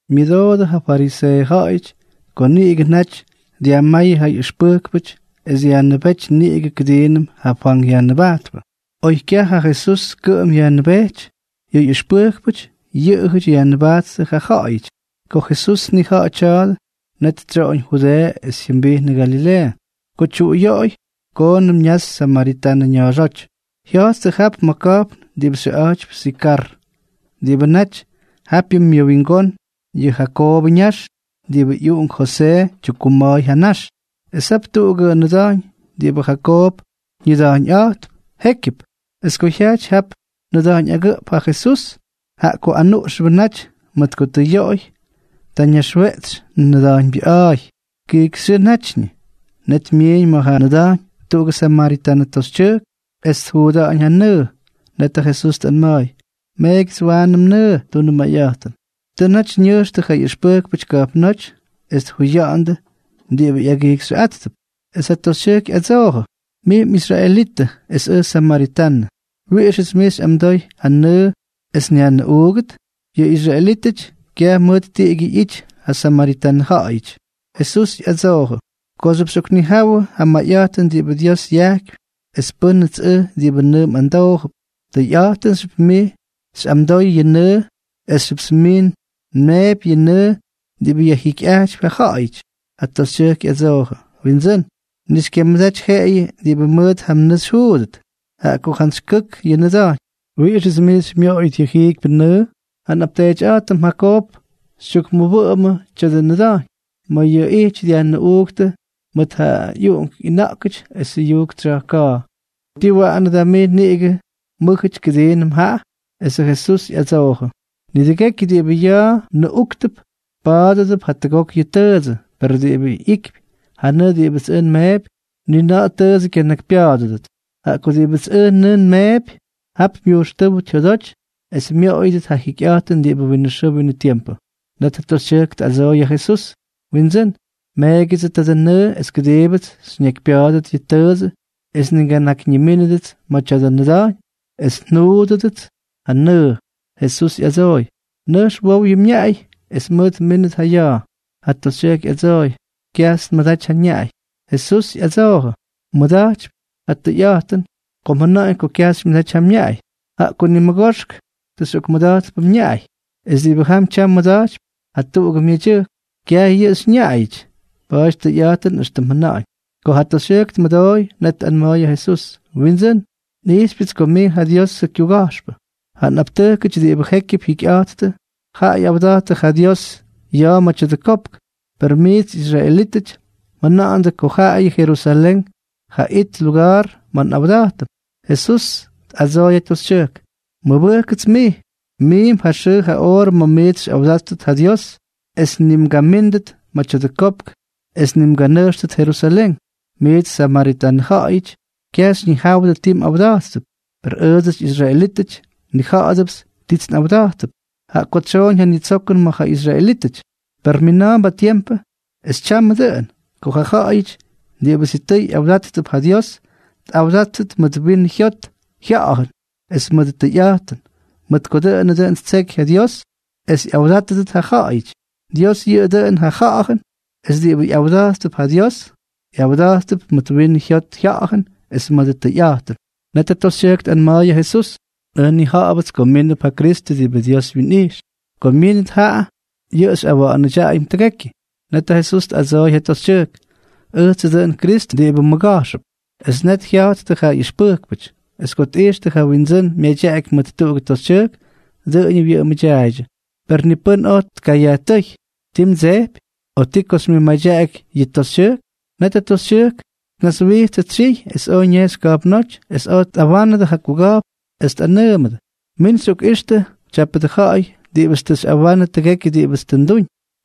Myʉdoodʉ ja fariseeʉ ja̱ꞌa̱yʉty ko niꞌigʉ naty dyajmáyʉ ja ꞌyʉxpʉjkpʉty es yajnʉbéty niꞌigʉ kʉdiinʉm ja Fwank Yajnʉbajtpʉ. Oy kyaj ja Jesús kʉꞌʉm yajnʉbejty, yʉ ꞌyʉxpʉjkpʉty yʉꞌʉjʉty yajnʉbajttʉ ja ja̱ꞌa̱yʉty. Ko Jesús tnija̱ꞌa̱jʉ tya̱a̱dʉ, net tsyoꞌoñ Judeeʉ es jyʉmbijnʉ Galileeʉ. Ko tyuꞌuyoꞌoy, koonʉm ñaxy samaritanʉ ña̱a̱xóty. Jya̱jttʉ jap ma̱ ka̱jpn diꞌibʉ xyʉꞌa̱jtypy Sikar, diꞌibʉ naty japyʉ myʉwingón yʉ Jakoobʉ ñax diꞌibʉ ꞌyuꞌunk Josee tyukkuma̱a̱y ja ñax. Es jap tuꞌugʉ nʉda̱jñ diꞌibʉ Jakoob ñʉda̱jñꞌa̱jt jékyʉp. Es ko jyajty jap nʉda̱jñ agʉꞌp ja Jesús, jaꞌa ko anuꞌxʉbʉ naty mʉt ko tʉ yoꞌoy, ta ñaxweꞌtsy nʉda̱jñbyʉꞌa̱a̱y. Kijkyxyʉʉ natyñʉ. Net myiiñ ma̱ ja nʉda̱jñ tuꞌugʉ samaritanʉ toxytyʉjk es tjuuda̱ꞌa̱ñ ja nʉʉ. Net ja Jesús tꞌanma̱a̱y: —Meegyʉts waanʉ mnʉʉ, tunʉ mayꞌa̱jtʉn. Tʉ naty ñʉjxtʉ ja ꞌyʉxpʉjkpʉty ka̱jpnóty es tjuya̱ꞌa̱ndʉ diꞌibʉ ꞌyagijxyʉꞌáttʉp. Es ja toxytyʉjk ꞌyadsoojʉ: —Mij mꞌisraelitʉ, es ʉj samaritanʉ. ¿Wiꞌixʉts mij xyꞌamdoy ja nʉʉ es nyajnʉꞌuugʉt? (Yʉ israelítʉty kyaj mʉt tiꞌigyʉ ꞌyity ja samaritanʉ ja̱ꞌa̱yʉty.) Jesús ꞌyadsoojʉ: —Kooxyʉp xyꞌoknijawʉ ja mayꞌa̱jtʉn diꞌibʉ Dios yajkypy es pʉ́nʉts ʉj diꞌibʉ nʉʉ mꞌamdoojʉp, tʉyꞌa̱jtʉnxyʉpts mij xyꞌamdoy yʉ nʉʉ, es ʉjxyʉpts mij nmeepy yʉ nʉʉ diꞌibʉ yajjikyꞌajtypy ja ja̱ꞌa̱yʉty. Ja toxytyʉjk ꞌyadsoojʉ: —Windsʉ́n, ni xykyamʉdaty jeꞌeyʉ diꞌibʉ mʉt ja nʉʉ xyjuudʉt. Jaꞌa ko jantsy kʉk yʉ nʉda̱jñ, ¿wiꞌixʉts mij xymyoꞌoyʉt yʉ jiikypyʉ nʉʉ? Ja nꞌapteetyꞌa̱jtʉm Jakoob xytyukmʉwʉꞌʉmʉmʉ tya̱dʉ nʉda̱jñ, ma̱ yʉꞌʉ ijty ñʉꞌuuktʉ mʉt ja ꞌyuꞌunk ꞌyʉna̱ꞌkʉty esʉ jyʉyujk tsya̱jka̱a̱. ¿Tii waꞌanʉ da mij niꞌigʉ mʉ́jʉty kʉdiinʉm jaꞌa? Esʉ Jesús ꞌyadsoojʉ: —Nidʉgekyʉ diꞌibʉ ya̱a̱ nʉꞌúktʉp, pa̱a̱dʉdʉp jatʉgok yʉ tʉʉdsʉ, per diꞌibʉ ꞌyikypy ja nʉʉ diꞌibʉts ʉj nmeepy, ni na̱ꞌa̱ tʉʉdsʉ kyanakypya̱a̱dʉdʉt. Jaꞌa ko diꞌibʉts ʉj nʉʉ nmeepy, jap myujxtʉ́wʉt jyodoty es myoꞌoyʉdʉt ja jikyꞌa̱jtʉn diꞌibʉ winʉ xʉʉ winʉ tiempʉ. Net ja toxytyʉjk tꞌadsooy ja Jesús: —Windsʉ́n, meegyʉdsʉ tadʉ nʉʉ es kʉdiibʉts xyñakypya̱a̱dʉt yʉ tʉʉdsʉ es ni nganakymyínʉdʉts ma̱ tya̱dʉ nʉda̱jñ es njuudʉdʉts ja nʉʉ. Jesús ꞌyadsooy: —Nʉjx wow yʉ mñaꞌay es mʉʉt mmíndʉt ja ya̱a̱. Ja toxytyʉjk ꞌyadsooy: —Kyajts nmʉdaty ja nñaꞌay. Jesús ꞌyadsoojʉ: —Mmʉda̱jtypy ja tʉyꞌa̱jtʉn ko mjʉna̱ꞌa̱ñ kyaj xymyʉdaty ja mñaꞌay, jaꞌa ko nimʉgoxk tʉ xyꞌokmʉda̱jtpʉ mñaꞌay, es diꞌibʉ jam tyam mmʉda̱jtypy jatuꞌugʉ myedyʉjk, kyaj yʉꞌʉ xyñaꞌayʉty. Pa̱a̱ty tʉyꞌa̱jtʉn éxtʉm mjʉna̱ꞌa̱ñ. Ko ja toxytyʉjk tmʉdooy, net tꞌanma̱a̱y ja Jesús: —Windsʉ́n, nꞌijxypyʉts ko mij ja Diosʉ kyuga̱jxpʉ. Ja nꞌaptʉjkʉty diꞌibʉ jékyʉp jyikyꞌa̱jttʉ, jaꞌa ꞌyawda̱jttʉ ja Dios ya̱a̱ ma̱ tya̱dʉ kopk. Per miits israelítʉty mjʉna̱ꞌa̱ndʉ ko jaayʉ Jerusalén ja it luga̱a̱r ma̱ nꞌawda̱jtʉm. Jesús tꞌadsooy ja toxytyʉjk: —Mʉbʉjkkʉts mij, miimp ja xʉʉ ja oorʉ ma̱ miits xyꞌawdáttʉt ja Dios, es ni mgamíndʉt ma̱ tya̱dʉ kopk es ni mganʉjxtʉt Jerusalén. Miits samaritanʉ ja̱ꞌa̱yʉty, kyaj xyñijáwʉdʉ ti mꞌawda̱jttʉp, per ʉʉdsʉty israelítʉty, nnija̱ꞌa̱dʉpts tits nꞌawda̱jttʉp, jaꞌa ko tsyooñ ja nitsokʉn ma̱ ja israelítʉty. Per mina̱a̱mp ja tiempʉ, es tyamʉ dʉꞌʉn, ko ja ja̱ꞌa̱yʉty diꞌibʉ sitʉy yꞌawda̱jttʉp ja Dios, tꞌawdáttʉt mʉt winʉ jyot jya̱ꞌa̱jʉn es mʉdʉ tʉyꞌa̱jtʉn, mʉt ko dʉꞌʉnʉ dʉn ttseky ja Dios es ꞌyawdátʉdʉt ja ja̱ꞌa̱yʉty. Dios yʉꞌʉ dʉꞌʉn ja Ja̱ꞌa̱jʉn, es diꞌibʉ ꞌyawda̱jttʉp ja Dios, ꞌyawdáttʉp mʉt winʉ jyot jya̱ꞌa̱jʉn es mʉdʉ tʉyꞌa̱jtʉn. Net ja toxytyʉjk tꞌanma̱a̱y ja Jesús: —Ʉj nnija̱ꞌa̱bʉts ko mínʉp ja Kristʉ diꞌibʉ Dios wyinꞌijx. Ko myínʉt jaꞌa, yʉꞌʉ xyꞌawa̱ꞌa̱nʉdyaꞌayʉm tʉgekyʉ. Net ja Jesús tꞌadsooy ja toxytyʉjk: —Ʉjtsʉ dʉꞌʉn Kristʉ diꞌibʉ mmʉga̱jxʉp. Es net jya̱jttʉ ja ꞌyʉxpʉjkpʉty. Es ko tꞌijxtʉ ja Wyindsʉ́n myadyaꞌaky mʉt tuꞌugʉ toxytyʉjk, dʉꞌʉñʉ wyʉꞌʉmʉdyaaydyʉ. Per ni pʉ́n oj tkayajtʉ́y: “¿Ti mdsejpy?” o “¿Ti ko xymyʉtmadyaꞌaky yʉ toxytyʉjk?” Net ja toxytyʉjk tnaswijtsʉ tsyiy es oj ñejxy ka̱jpnóty es oj tꞌawánʉdʉ ja kuga̱jpn es tꞌanʉʉmʉdʉ: —Min xyꞌokꞌixtʉ tyápʉdʉ ja̱ꞌa̱y diꞌibʉts tʉ xyꞌawanʉ tʉgekyʉ diꞌibʉts tʉ nduñ.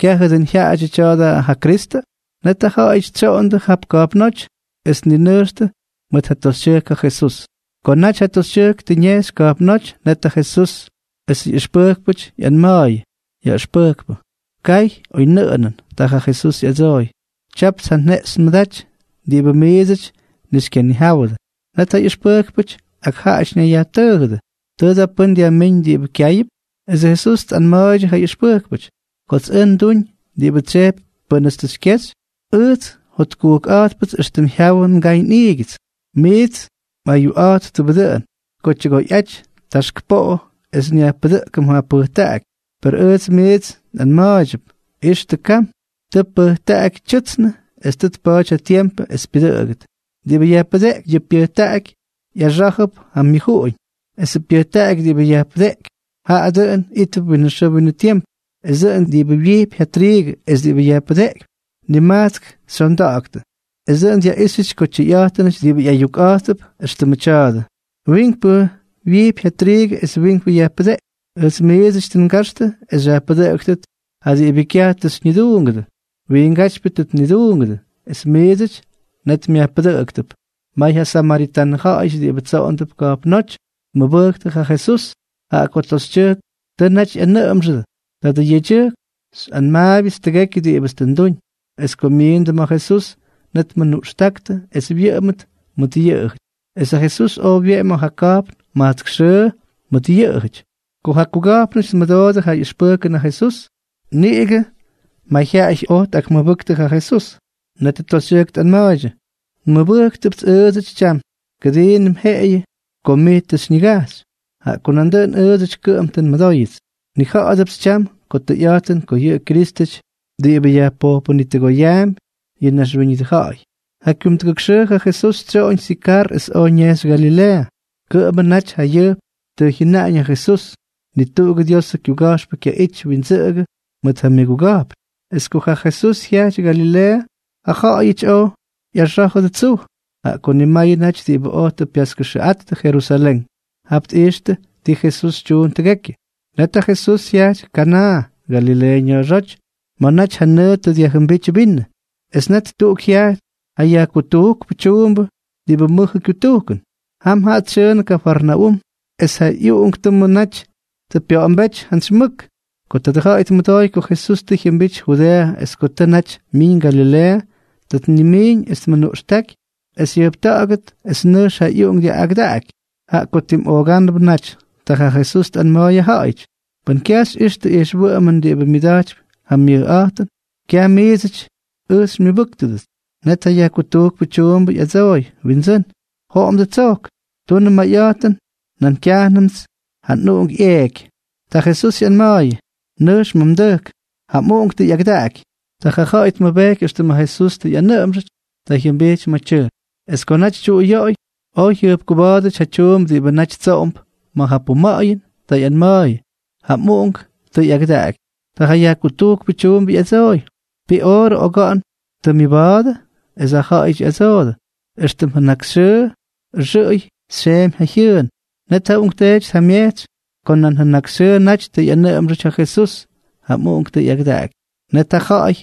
¿Kyajʉ dʉꞌʉn jyaꞌadyʉ tya̱a̱dʉ ja Kristʉ? Net ja ja̱ꞌa̱yʉty tsyoꞌondʉ jap ka̱jpnóty es tninʉjxtʉ mʉt ja toxytyʉjk ja Jesús. Ko naty ja toxytyʉjk tʉ ñejxy ka̱jpnóty, net ja Jesusʉ ꞌyʉxpʉjkpʉty ꞌyanma̱a̱yʉ: —Yaꞌʉxpʉjkpʉ, kay oynʉꞌʉnʉn. Ta ja Jesús ꞌyadsooy: —Tyapts ja jeꞌxy nmʉdaty diꞌibʉ miidsʉty ni xykyanijáwʉdʉ. Net ja ꞌyʉxpʉjkpʉty ak jaꞌajʉty ñayyajtʉʉjʉdʉ: —¿Tʉ da pʉ́n dyajmíñ diꞌibʉ kyáyʉp? Esʉ Jesús tꞌanma̱a̱ydyʉ ja ꞌyʉxpʉjkpʉty: —Kots ʉj nduñ diꞌibʉ tsyejpy pʉ́nʉts tʉ xykyexy, ujts jotkʉdákpʉts éxtʉm jyawʉ ngay nꞌiigyʉts. ’Miits mꞌayukꞌa̱jttʉbʉ dʉꞌʉn: “Ko tyʉgoyꞌaty taxk poꞌo es nyajpʉdʉꞌkʉm ja pʉjtaꞌaky.” Per ʉjts miits nꞌanma̱a̱ydyʉp: “¡Ixtʉ kam! Tʉ pʉjtaꞌaky tyʉtsnʉ es tʉ tpa̱a̱ty ja tiempʉ es pyʉdʉꞌʉgʉt.” Diꞌibʉ yajpʉdeꞌkypy ja pyʉjtaꞌaky, ꞌyaxá̱jʉp ja myʉjuꞌuñ; esʉ pyʉjtaꞌaky diꞌibʉ yajpʉdeꞌkypy, jaꞌa dʉꞌʉn ítʉp winʉ xʉʉ winʉ tiempʉ. Es dʉꞌʉn diꞌibʉ wyijpy ja triigʉ es diꞌibʉ yajpʉdeꞌkypy, nimajtsk xyonda̱ꞌa̱ktʉ. Es dʉꞌʉn dyaꞌíxyʉty ko tyʉyꞌa̱jtʉnʉty diꞌibʉ ꞌyayukꞌa̱jttʉp éxtʉmʉ tya̱a̱dʉ: “Wiinkpʉ wyijpy ja triigʉ es wiinkpʉ yajpʉdeꞌkypy.” Ʉjts miidsʉty tʉ ngaxtʉ es xyajpʉdʉꞌʉktʉt ja diꞌibʉ kyaj tʉ xyñiduungʉdʉ. Wiingátypyʉ tʉ tniduungʉdʉ, es miidsʉdyʉ net myajpʉdʉꞌktʉp. May ja samaritanʉ ja̱ꞌa̱yʉty diꞌibʉ tsoꞌondʉp ka̱jpnóty tmʉbʉjktʉ ja Jesús, jaꞌa ko ja toxytyʉjk tʉ naty ꞌyanʉꞌʉmxʉdʉ: “Tadʉ yedyʉjk xyꞌanma̱a̱yʉts tʉgekyʉ diꞌibʉts tʉ nduñ.” Es ko myiindʉ ma̱ Jesús, net tmʉnuꞌxtáktʉ es wyʉꞌʉmʉt mʉt yʉꞌʉjʉty. Es ja Jesús oj wyeꞌemy ma̱ ja ka̱jpn majtsk xʉʉ mʉt yʉꞌʉjʉty. Ko ja kuga̱jpnʉty tmʉdoodʉ ja ꞌyʉxpʉjkʉn ja Jesús, niꞌigʉ mayjyaꞌay oj tꞌakmʉbʉktʉ ja Jesús. Net ja toxytyʉjk tꞌanma̱a̱ydyʉ: —Nmʉbʉjknʉpts ʉʉdsʉty tyam, kʉdiinʉm jeꞌeyʉ ko mij tʉ xyñigajxy, jaꞌa ko nandʉꞌʉn ʉʉdsʉty kʉꞌʉm tʉ nmʉdóyʉts. Nnija̱ꞌa̱dʉpts tyam ko tʉyꞌa̱jtʉn ko yʉꞌʉ Kyrístʉty diꞌibʉ yajpojpʉnitʉgoyaampy yʉ naxwíñʉdʉ ja̱ꞌa̱y. Ja kyumdʉgʉk xʉʉ ja Jesús tsyoꞌoñ Sikar es oj ñejxy Galileeʉ. Kʉꞌʉmʉ naty jayʉjp tʉ jyʉnaꞌañ yʉ Jesús: “Ni tuꞌugʉ Diosʉ kyuga̱jxpʉ kyaꞌity windsʉꞌʉgʉ mʉt ja myʉguga̱jpn.” Es ko ja Jesús jyajty Galileeʉ, ja ja̱ꞌa̱yʉty oj ꞌyaxá̱jʉdʉ tsuj, jaꞌa ko nimayʉ naty diꞌibʉ oj tʉ pyaskʉxʉꞌattʉ Jerusalén. Jap tꞌijxtʉ ti Jesús tyuun tʉgekyʉ. Net ja Jesús jyajty Kanaa, Galileeʉ ña̱a̱xóty, ma̱ naty ja nʉʉ tʉ dyajjʉmbíty vinʉ. Es net tuꞌuk jyajty ja yajkutujkpʉ tyuumbʉ diꞌibʉ mʉjʉ kyutujkʉn. Jam jaꞌa tsyʉʉnʉ Kafarnaúm es ja ꞌyuꞌunktʉmʉ naty tʉ pya̱ꞌa̱mbéty jantsy mʉk. Ko tadʉ ja̱ꞌa̱y tmʉdooy ko Jesús tʉ jyʉmbity Judeeʉ es ko tʉ naty myiñ Galileeʉ, ta tnimiiñ es tmʉnuꞌxtáky es jyʉjpta̱ꞌa̱gʉt, es nʉjx ja ꞌyuꞌunk yaꞌꞌagʉdákxʉty, jaꞌa ko tim oogánʉbʉ naty. Ta ja Jesús tꞌanma̱a̱y ja ja̱ꞌa̱y: —Pʉn kyaj xyꞌixtʉ ijxwʉꞌʉmʉn diꞌibʉ myʉda̱jtypy ja mʉjꞌa̱jtʉn, kyaj miidsʉty ʉj xymyʉbʉ́ktʉt. Net ja yajkutujkpʉ tyuumbʉ ꞌyadsooy: —Windsʉ́n, joꞌomdʉ tsojk, tunʉ mayꞌa̱jtʉn, na̱a̱m kyajnʉmts ja nꞌuꞌunk ꞌyeeky. Ta Jesús ꞌyanma̱a̱yʉ: —Nʉjx ma̱ mdʉjk. Ja mꞌuꞌunk tʉ ꞌyagʉdaꞌaky. Ta ja ja̱ꞌa̱y tmʉbejky éxtʉm ja Jesús tʉ ꞌyanʉꞌʉmxʉty. Ta jyʉmbijty ma̱ tyʉjk. Es ko naty tyuꞌuyoꞌoy, oj jyʉjpkuba̱a̱dʉty ja tyuumbʉ diꞌibʉ naty tsoꞌondʉp ma̱ ja puma̱ꞌa̱yʉn. Ta ꞌyanma̱a̱yʉ: —¡Ja mꞌuꞌunk tʉ ꞌyagʉdaꞌaky! Ta ja yajkutujkpʉ tyuumbʉ ꞌyadsooy: —¿Ti oorʉ oga̱ꞌa̱n tʉ myʉba̱a̱dʉ? Es jaꞌajʉty ꞌyadsoodʉ: —Extʉm jʉnakxyʉʉ ʉxʉꞌʉy xyeemy ja jyʉʉn. Net ja uꞌunkteety tjamyejtsy ko nan janakxyʉʉ naty tʉ ꞌyanʉꞌʉmxʉty ja Jesús: “Ja mꞌuꞌunk tʉ ꞌyagʉdaꞌaky.” Net ja ja̱ꞌa̱y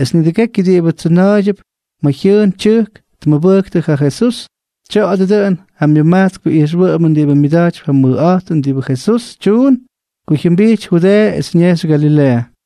es nidʉgekyʉ diꞌibʉ tsyʉna̱a̱ydyʉp ma̱ jyʉʉn tyʉjk tmʉbʉjktʉ ja Jesús. Tya̱a̱dʉ dʉꞌʉn ja myʉmajtskpʉ ijxwʉꞌʉmʉn diꞌibʉ myʉda̱jtypy ja mʉjꞌa̱jtʉn diꞌibʉ Jesús tyuun ko jyʉmbity Judeeʉ es ñejxy Galileeʉ.